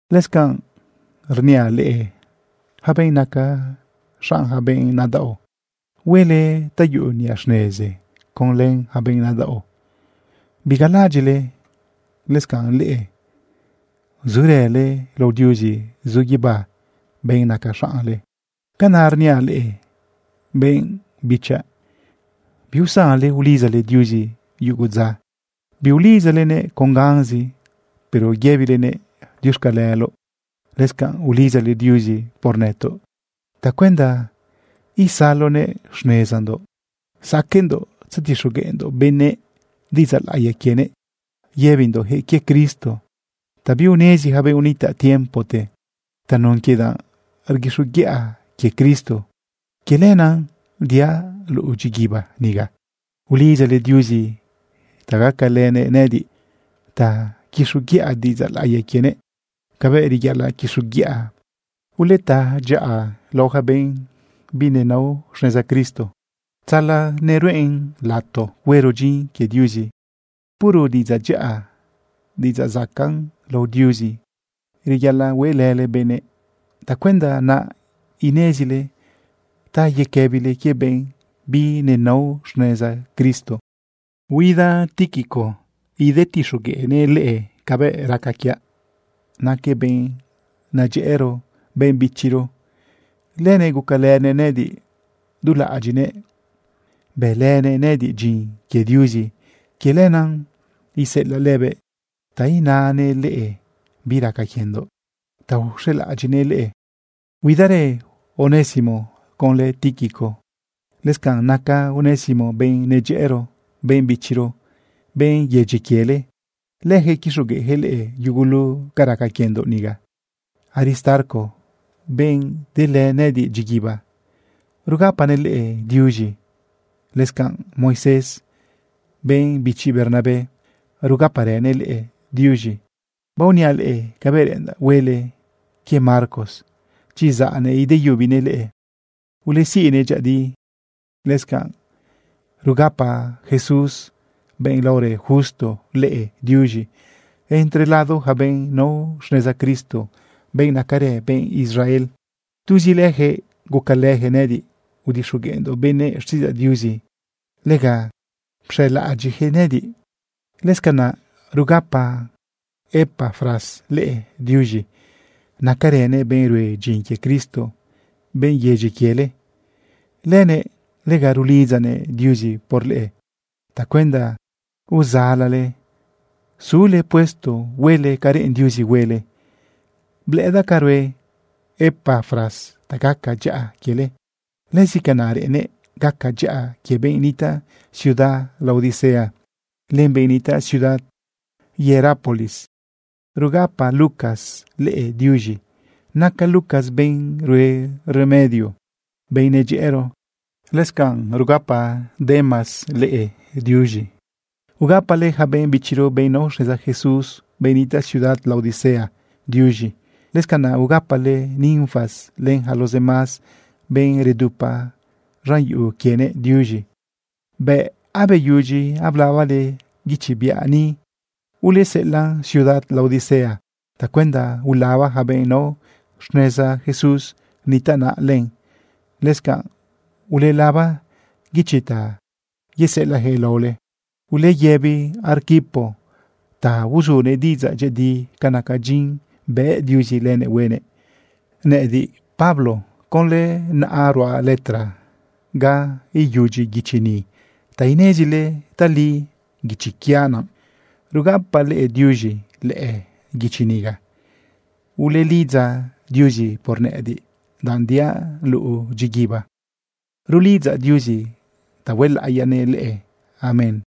Lëscanꞌ rniaꞌ leꞌe yaca benꞌ naca xaꞌn yaca benꞌ nadaꞌo: Huele ta yuꞌu niꞌa xnezi conlë yaca benꞌ nadaꞌo. Bigalaꞌadyiꞌle lëscanꞌ leꞌe zurële lao Diuzi zu guibá, benꞌ naca xaꞌnle. Canaꞌra rniaꞌ leꞌe, benꞌ bichaꞌ: Biusanle ulidzale Diuzi yugu dza. Biulidzalenëꞌ con ganzi, pero yëbilenëꞌ diuxcaleloꞌ. Lëscanꞌ ulidzale Diuzi por nëtoꞌ tacuenda isaloguëꞌ xnezandoꞌ saqueꞌndoꞌ tzatixogueꞌndoꞌ benëꞌ diꞌidzaꞌ laꞌiya quienëꞌ yëbindoꞌyaquëꞌ quie Cristo ta biunezi yaca benꞌ unitaꞌ tiempote. Tanun quie danꞌ rguixoguiꞌa quie Cristo, quie lenaꞌ diaꞌ luꞌu dyiguiba niga. Ulidzale Diuzi ta gacalënëꞌ nëꞌëdiꞌ ta quixoguiꞌa diꞌidzaꞌ laꞌiya quienëꞌ cabëꞌ reyaꞌalaꞌ quixoguiꞌa. Uleta dyaꞌa lao yaca benꞌ binenao xneza Cristo tzala neruꞌen lato huero dyin quie Diuzi. Puro diꞌidzaꞌ dyaꞌa, diꞌidzaꞌ zacaꞌn lao Diuzi, reyaꞌalaꞌ hueꞌlële benëꞌ tacuenda naꞌ inezile ta yequëbile quie benꞌ binenao xneza Cristo. Huida Tíquico idetixogueꞌnëꞌ leꞌe cabëꞌ raca quiaꞌ. Naquëꞌ benꞌ nadyëꞌëro, benꞌ bichiro. Lënëꞌ gucalënëꞌ nëꞌëdiꞌ. Dulaꞌadyiꞌnëꞌ bëlënëꞌ nëꞌëdiꞌ dyin quie Diuzi. Quie lenaꞌ iseꞌelaꞌ lëbëꞌ ta inanëꞌ leꞌe bi raca quiendoꞌ ta uxelaꞌadyiꞌnëꞌ leꞌe. Huidarë Onésimo conlë Tíquico. Lëscanꞌ naca Onésimo benꞌ nadyëꞌëro, benꞌ bichiro, benꞌ yedyi quiele. Leyaquëꞌ quixogueꞌyaquëꞌ leꞌe yugulu ca raca quiendoꞌ niga. Aristarco, benꞌ delë nëꞌëdiꞌ dyiguiba, rugapanëꞌ leꞌe diuz̃i. Lëscanꞌ Moisés, benꞌ bichi Bernabé, rugaparënëꞌ leꞌe diuz̃i. Baoniaꞌ leꞌe cabëꞌ reꞌendaꞌ huele quie Marcos. Chi zaꞌnëꞌ ideyubinëꞌ leꞌe, uleziꞌnëꞌ dyëꞌëdi. Lëscanꞌ rugapa Jesús, benꞌ laorë Justo, leꞌe diuz̃i. Entre lado yaca benꞌ nao xneza Cristo, benꞌ nacarë benꞌ Israel, tuzi leyaquëꞌ gucalëyaquëꞌ nëꞌëdiꞌ udixogueꞌndoꞌ benëꞌ xtiꞌidzaꞌ Diuzi. Lega pxelaꞌadyiꞌyaquëꞌ nëꞌëdiꞌ. Lëscanaꞌ rugapa Epafras leꞌe diuz̃i. Nacarënëꞌ benꞌ rue dyin quie Cristo, benꞌ yedyi quiele. Lënëꞌ lega rulidzanëꞌ Diuzi por leꞌe tacuenda uzalale zule puesto huele ca reꞌen Diuzi huele. Blëꞌëdaꞌ ca rue Epafras ta gaca dyaꞌa quiele. Lëzi canaꞌ reꞌennëꞌ gaca dyaꞌa quie benꞌ nitaꞌ ciudad Laodicea, len benꞌ nitaꞌ ciudad Hierápolis. Rugapa Lucas leꞌe diuz̃i. Naca Lucas benꞌ rue remedio, benꞌ nadyëꞌëro. Lëscanꞌ rugapa Demas leꞌe diuz̃i. Ugapale yaca benꞌ bichiro, benꞌ nao xneza Jesús, benꞌ nitaꞌ ciudad Laodicea, diuz̃i. Lëscanaꞌ ugapale Ninfas, len yaca los demás benꞌ redupa z̃an yuꞌu quienëꞌ, diuz̃i. Bëꞌ abeyudyi ablabale guichi biaꞌ ni, uleseꞌelaꞌn ciudad Laodicea tacuenda ulaba yaca benꞌ nao xneza Jesús nitaꞌ naꞌ len. Lëscanꞌ ulelaba guichi ta yeseꞌelaꞌyaquëꞌ laole. Uleyëbi Arquipo ta uzunëꞌ diꞌidzaꞌ dyëꞌëdi ca naca dyin bëꞌ Diuzi lënëꞌ huenëꞌ. Nëꞌëdiꞌ, Pablo, conlë naꞌa ruaꞌ letra ga iyudyi guichi ni ta inezile tali guichi quiaꞌ naꞌ. Rugapaꞌ leꞌe diuz̃i lëꞌë guichi niga. Uleulidza Diuzi por nëꞌëdiꞌ, danꞌ diaꞌ luꞌu dyiguiba. Rulidzaꞌ Diuzi ta huelaꞌiyanëꞌ leꞌe. Amén.